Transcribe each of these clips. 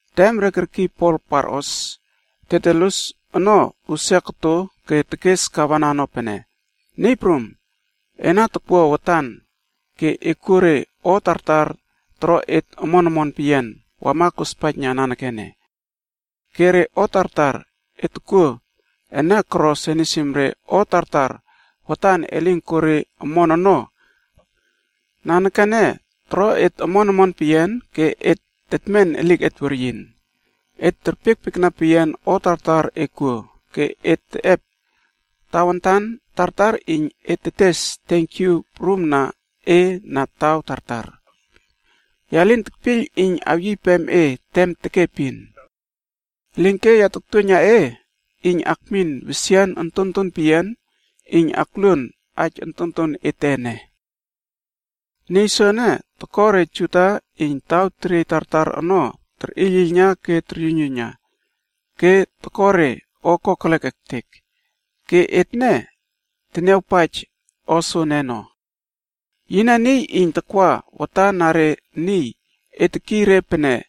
Tem re kerkiy Pol parꞌos, Tertulus ono usia koto ke tekes Gavena ono pene, “Niy prum, ena takwua watan ke e kuo re o tartar toro et omon omon peyian wama kospaijna nanekene. Ke re o tartar e tokuo ene koro senisim re o tartar watan elin koro omon ono nanekene toro et omon omon peyian ke et tetmen eliket weryin. Et terpiekpiekna peyian o tartar e kuo, ke et teꞌep tawantan tartar iyn et tetes tenkyu prum na e na taw tartar. Ya lin tekpiyl iyn awyiypem e tem tekepin. Elinke ya taktuoiyna e iyn akmin wesian ontonton peyian iyn akluon aij ontonton ete ene. “Niy soene toko re Juda iyn taw teriey tartar ono terꞌiylꞌiylna ke toryuiynyuiyna ke toro re o kokelek ektek. Ke etne teniawpaij o soene ono. Yine niy iyn takwa watan na re niy re terkiy re pene,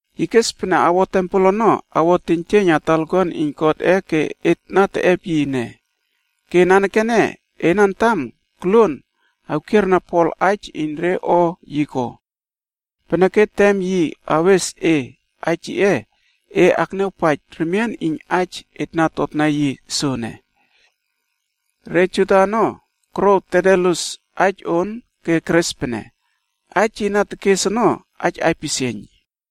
Yi kes pene awo tempel ono awo teiynjieiyn na talakuan iyn Godꞌe ke et na teꞌep yi ene.b Ke nanekene ena antam koluon awkierna Pol aij iyn re o yi ko. Peneke tem yi awes e aij yiꞌe, e akniawpaij remien iyn aij et na totna yi soene.” Re Juda ono korouw Tertulus aij on ke keres pene, “Aij yi na tekes ono, aij aipisieiyn.”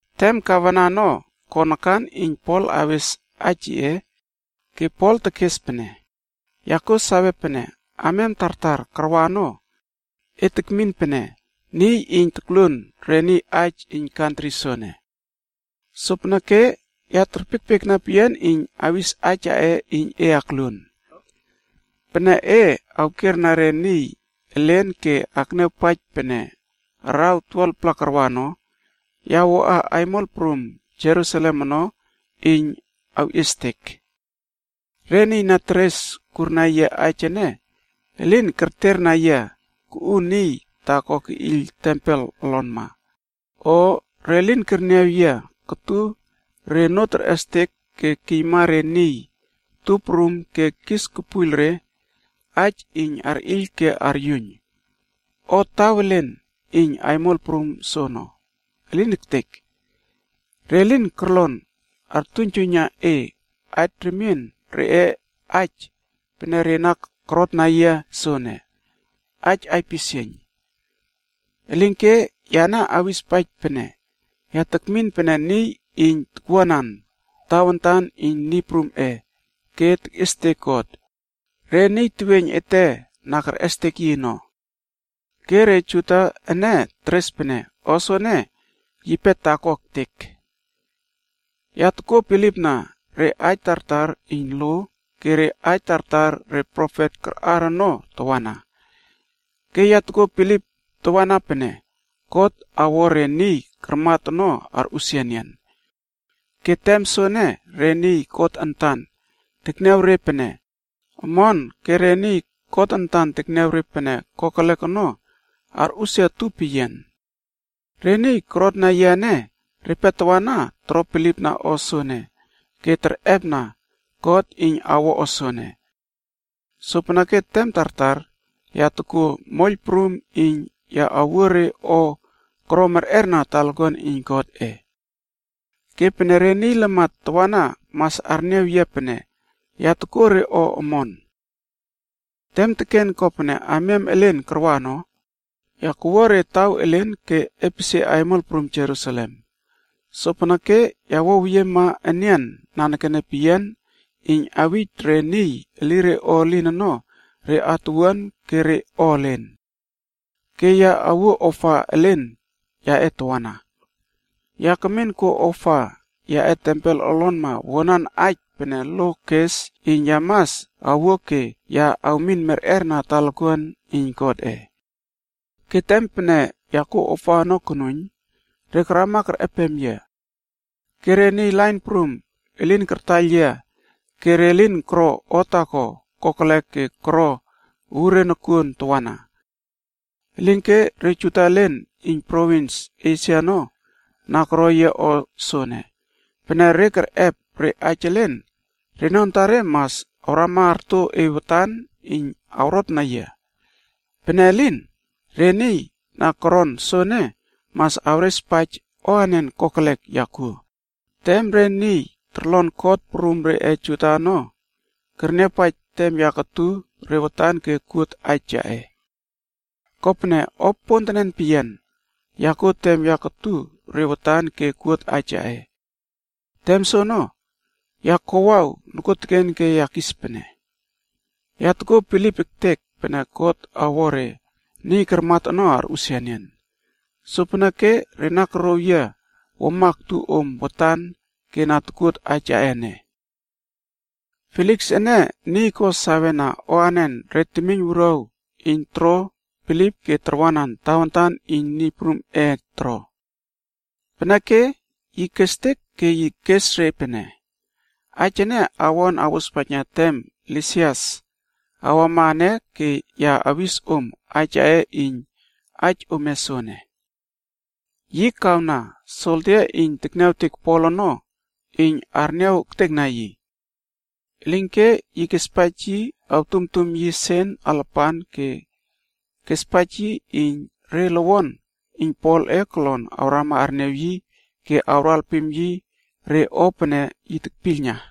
Tem Gavena ono ko nakan iyn Pol awes aij yiꞌe, ke Pol tekes pene, “Ya kuo sawe pene amiam tartar karwa ono, e tekmin pene niy iyn tokluon re niy aij iyn kantri soene. Sopeneke ya terpiekpiekna peyian iyn awis aij yaꞌe iyn e akluon. Pene e awkierna re niy elen ke akniawpaij pene araw 12-pla karwa ono, ya wuaꞌa aimol prum Jerusalem ono iyn awꞌiestek. Re niy na teres kurna yia aij ene elin kerterna yia kuꞌu niy taako keꞌiyl tempel olonma, o re lin kerniaw yia kotu re onoo terꞌestek ke kiyma re niy tup prum ke kis kepuiyl re aij iyn arꞌiyl ke aryuiyn, o taw elen iyn aimol prum soono. Elin ektek! Re lin korlon artuiynjuiyna e aij remien reꞌe aij pene re na korotna yia soene, aij aipisieiyn. Elinke, yane awispaij pene ya tekmin pene niy iyn takwuanan Tawantanc iyn Niy Prumꞌe ke tekꞌiestek God, re niy teweiyn ete na kerꞌestek yi ono. Ke re Juda ene teres pene o soene yipe taako ektek. Ya tokuo bilipna re aij tartar iyn lo ke re aij tartar re profet karꞌar ono tawana. Ke ya tokuo bilip tawana pene God awo re niy karmat ono arꞌusia enian. Ke tem soene, re niy God antan tekniaw re pene omon ke re niy yi tekniaw re pene kokelek ono arꞌusia utup peyian. Re niy korotna yia ene, repe tawana toro bilipna o soene pene yape ke et niy tartar oton tetꞌepna peyian iyn atniaw God awo o soene. Sopeneke tem tartar ya tokuo moiyl prum iyn ya awuo re o koro merꞌer na talakuan iyn Godꞌe. Ke pene re niy lamat tawana mas arniaw yia pene ya tokuo re o omon. “Tem teken kopene amiam elen karwa ono, ya kawua re taw elen ke epesie aimol prum Jerusalem. Sopeneke ya wuaweyiema enian nanekene peyian iyn awij re niy elire o elin ono re atuwuan ke re o elen. Ke ya awuo ofa elen yaꞌe tawana. Ya kemin kuo ofa yaꞌe tempel olonma wuanan aij pene lo kes iyn ya mas awuo ke ya awmin merꞌer na talakuan iyn Godꞌe. Ke tem pene ya kuo ofa ono konuiyn, re karama kerꞌeptawa yia. Ke re niy lain prum elin kartaiyl yia ke re lin koro o taako kokelek ke koro uure nokuon tawana. Elinke re Juda elen iyn provins Esia ono na koro yia o soene. Pene re kerꞌep re aij elen, reno antare mas awrama arto e watan iyn awrotna yia. Pene elin, re niy na koron soene mas awrespaij o anen kokelek ya kuo, tem re niy torlon kot prum reꞌe Juda ono kerniawpaij tem ya kotu re watan ke kuot aij yaꞌe. Kopene o pontenen peyian ya kuo tem ya kotu re watan ke kuot aij yaꞌe. Tem soono, ya kowaw nokuoteken ke ya kis pene, ‘Ya tokuo bilip ektek pene God awo re niy karmat ono arꞌusia enian.’ Sopeneke re na korouw yia wuama aktu om watan ke na tokuot aij yaꞌe ene.” Feliks ene niy ko sawena o anen re temiyn wuruaw iyn toro bilip ke tarwanan Tawantan iyn Niy Prumꞌe ene toro. Peneke yi kestek ke yi kes re pene, “Aij ene awon awospaijna tem Lisias awama ene ke ya awis om aij yaꞌe iyn aij ome soene.” Yi kawna soldia iyn tekniawtek Pol ono iyn arniaw ektekna yi. Elinke yi kespaij yi awtumtum yi sen alapan ke yi kespaij yi iyn re lowon iyn Polꞌe kolon awrama arniaw yi ke awro alpim yi re o pene yi tekpiylna.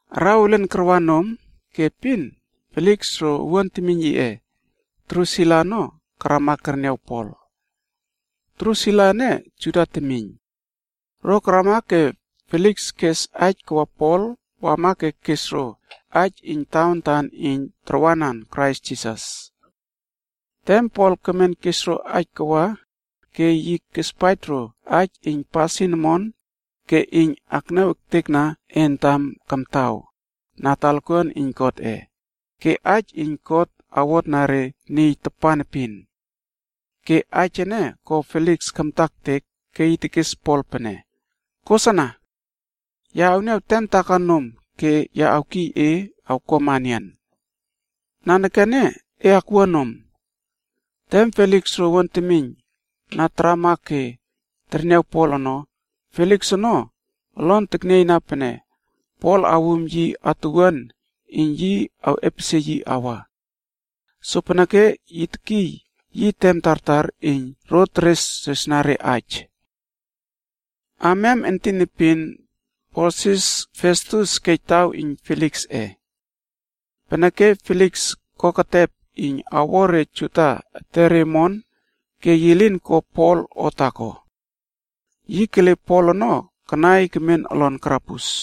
Araw elen karwa nom ke epin Feliks ro owuan temiyn yiꞌe Drusila ono wama kerniaw Pol. Drusila ene Juda temiyn. Ro karama ke Feliks kes aij kawa Pol wama iyn kesna ro aij iyn tawantan iyn awro bilipna Krais Jisas. Tem Pol kemen kes ro aij kawa ke yi kespaij ro aij iyn pasin omon ke iyn akniaw ektekna entam kamtaw na talakuan iyn Godꞌe, ke aij iyn God awotna re niy tapan epin. Ke aij ene ko Feliks kamta ektek ke yi tekes Pol pene, “Kosana. Ya awniaw tem taako nom ke ya awkiy e awkuama enian. Nanekene e akwua nom.” Tem Feliks ro owuan temiyn na tarama ke terniaw Pol ono, Feliks ono olon teknieiyna pene Pol awum yi atuwuan iyn yi awꞌepesie yi awa. Sopeneke yi tekiy yi tem tartar iyn ro teresresna re aij. Amiam entin epin Porsius Festus kej taw iyn Feliksꞌe. Peneke Feliks ono espaij re Juda ono ke yi koketep iyn awo re etere omon ke yi lin ko Pol o taako. Yi kele Pol ono kanai kemen olon karabus.